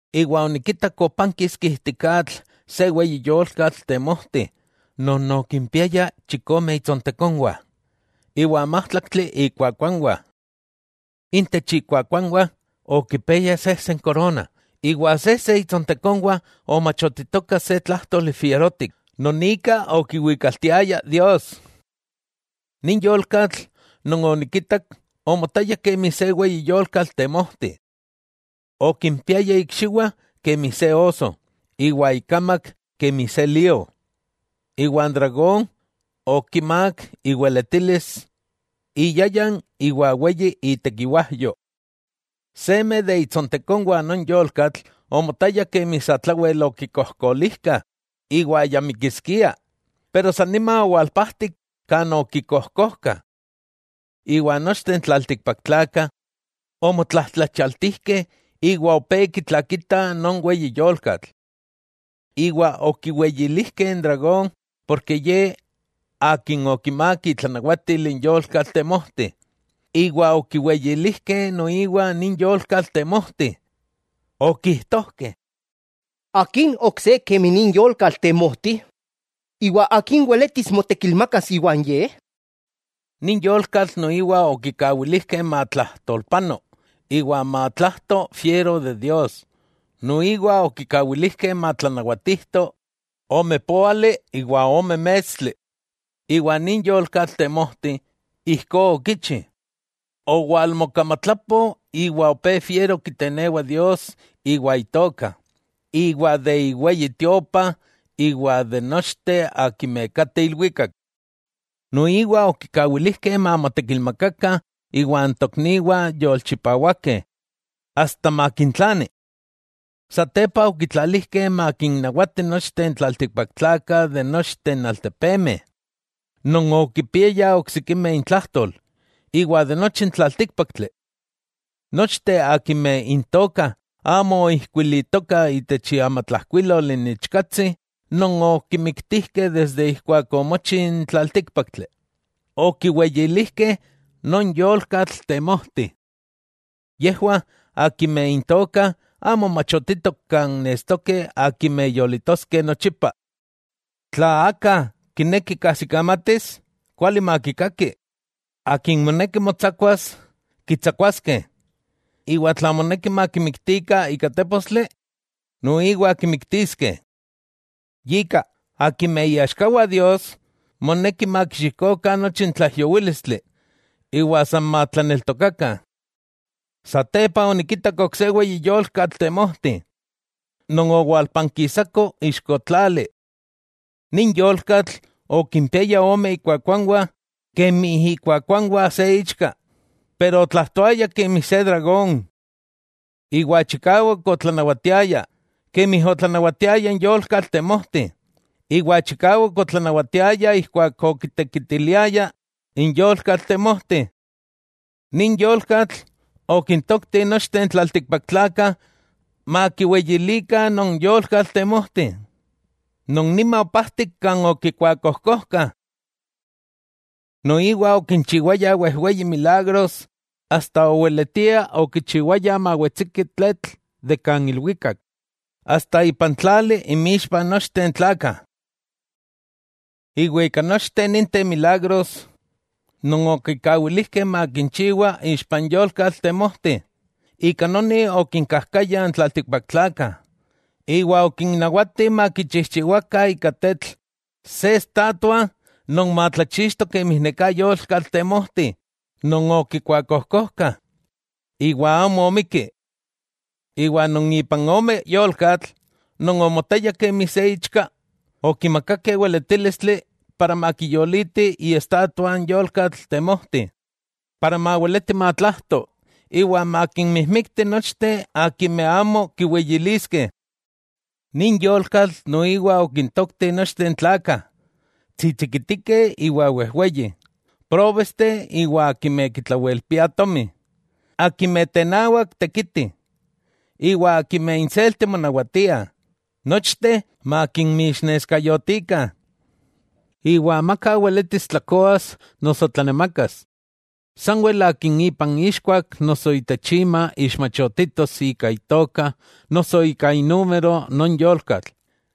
Iwa onikitak opankiski ijtik atl se weyi yolkatl temojti non okimpiaya chikome itsontekonwah iwa májtlaktli ikuakuanwah. Intech ikuakuanwah okipiaya sejse n korona, iwa sejse itsontekonwah omachotitoka se tlájtoli fierotik non ika okiwikaltiaya Dios. Nin yolkatl non onikitak, omotaya kemi se weyi yolkatl temojti. Okimpiaya ikxiwah kemi se oso, iwa ikamak kemi se lío. Iwa n dragón okimák iweletilis, iyayan iwa weyi itekiwajyo. Seme de itsontekonwah non yolkatl omotaya kemi satlawel okikojkolijkah iwa ya mikiskia, pero san nima owalpajtik kan okikojkojkah. Iwa nochteh n tlaltikpaktlakah omotlajtlachialtijkeh iwa opé kitlakitah non weyi yolkatl. Iwa okiweyilijkeh n dragón porke ye akin okimák itlanawatil n yolkatl temojti, iwa okiweyilijkeh noiwa nin yolkatl temojti. Okijtojkeh: —¿Akin ok se kemi nin yolkatl temojti, iwa akin weletis motekilmakas iwan ye? Nin yolkatl noiwa okikawilijkeh matlajtolpano iwa matlajto fiero de Dios, noiwa okikawilijkeh matlanawatijto ome póali iwa ome mestli. Iwa nin yolkatl temojti, ijkó okichi, owalmokamatlapo iwa opé fiero kitenewa Dios iwa Itoka, iwa de iweyi Tiopa iwa de nochteh akimeh kateh ilwikak. Noiwa okikawilijkeh mamotekilmakakah iwa n tokniwah yolchipawakeh asta makintlani. Satepa okitlalijkeh makinnawati nochteh n tlaltikpaktlakah de nochteh n altepemeh, non okipiayah oksikimeh intlajtol, iwa nochi n tlaltíkpaktli. Nochteh akimeh intokah amo oijkuilitoka itech iamatlajkuilol n Ichkatsi non okimiktijkeh desde ijkuak omochi n tlaltíkpaktli, okiweyilijkeh non yolkatl temojti. Yejwah akimeh intokah amo machotitok kan nestokeh akimeh yolitoskeh nochipa. ¡Tla aka kineki kajsikamatis, kuali makikaki! Akin moneki motsakuas, kitsakuaskeh. Iwa tla moneki makimiktikah ika tépostli, noiwa kimiktiskeh. Yika, akimeh iaxkawah Dios, moneki makixikokah nochi tlaijyowílistli iwa san matlaneltokakah. Satepa, onikitak ok se weyi yolkatl temojti, non owalpankisako ixko tlali. Nin yolkatl okimpiaya ome ikuakuanwah kemi ikuakuanwah se ichka, pero otlajtoaya kemi se dragón. Iwa chikawak otlanawatiaya, kemi otlanawatiaya n yolkatl temojti, iwa chikawak otlanawatiaya ijkuak okitekitiliaya n yolkatl temojti. Nin yolkatl, okintokti nochteh n tlaltikpaktlakah makiweyilikah non yolkatl temojti, non san nima opajtik kan okikuakojkojkah. Noiwa okinchiwaya wejweyi milagros, asta okichiwaya mawetsiki tletl de kan ilwikak itech tlali inmixpah nochteh n tlakah. Iwa ika nochteh ninteh milagros non okikawilijkeh makinchiwa ixpa n yolkatl temojti, ika noni okinkajkaya n tlaltikpaktlakah iwa okinnawati makichijchiwakah ika tetl se estatua non matlachixto kemi neká yolkatl temojti non okikuakojkojkah iwa amo omikki. Iwa non ipan ome yolkatl non omotaya kemi se ichka, okimakakeh weletílistli para makiyoliti iestatua n yolkatl temojti, para maweleti matlajto iwa makinmijmikti nochteh akimeh amo kiweyiliskeh. Nin yolkatl noiwa okintokti nochteh n tlakah, tsitsikitikeh iwa wejweyih, próbesteh iwa akimeh kitlawelpiah tomi, akimeh tenawak tekitih, iwa akimeh inselti monawatiah, nochteh makinmixneskayotikah. Iwa amaka weletis tlakoas noso tlanemakas, sanwel akin ipan ixkuak noso itech ima ixmachotitos ika itoka noso ika inúmero non yolkatl.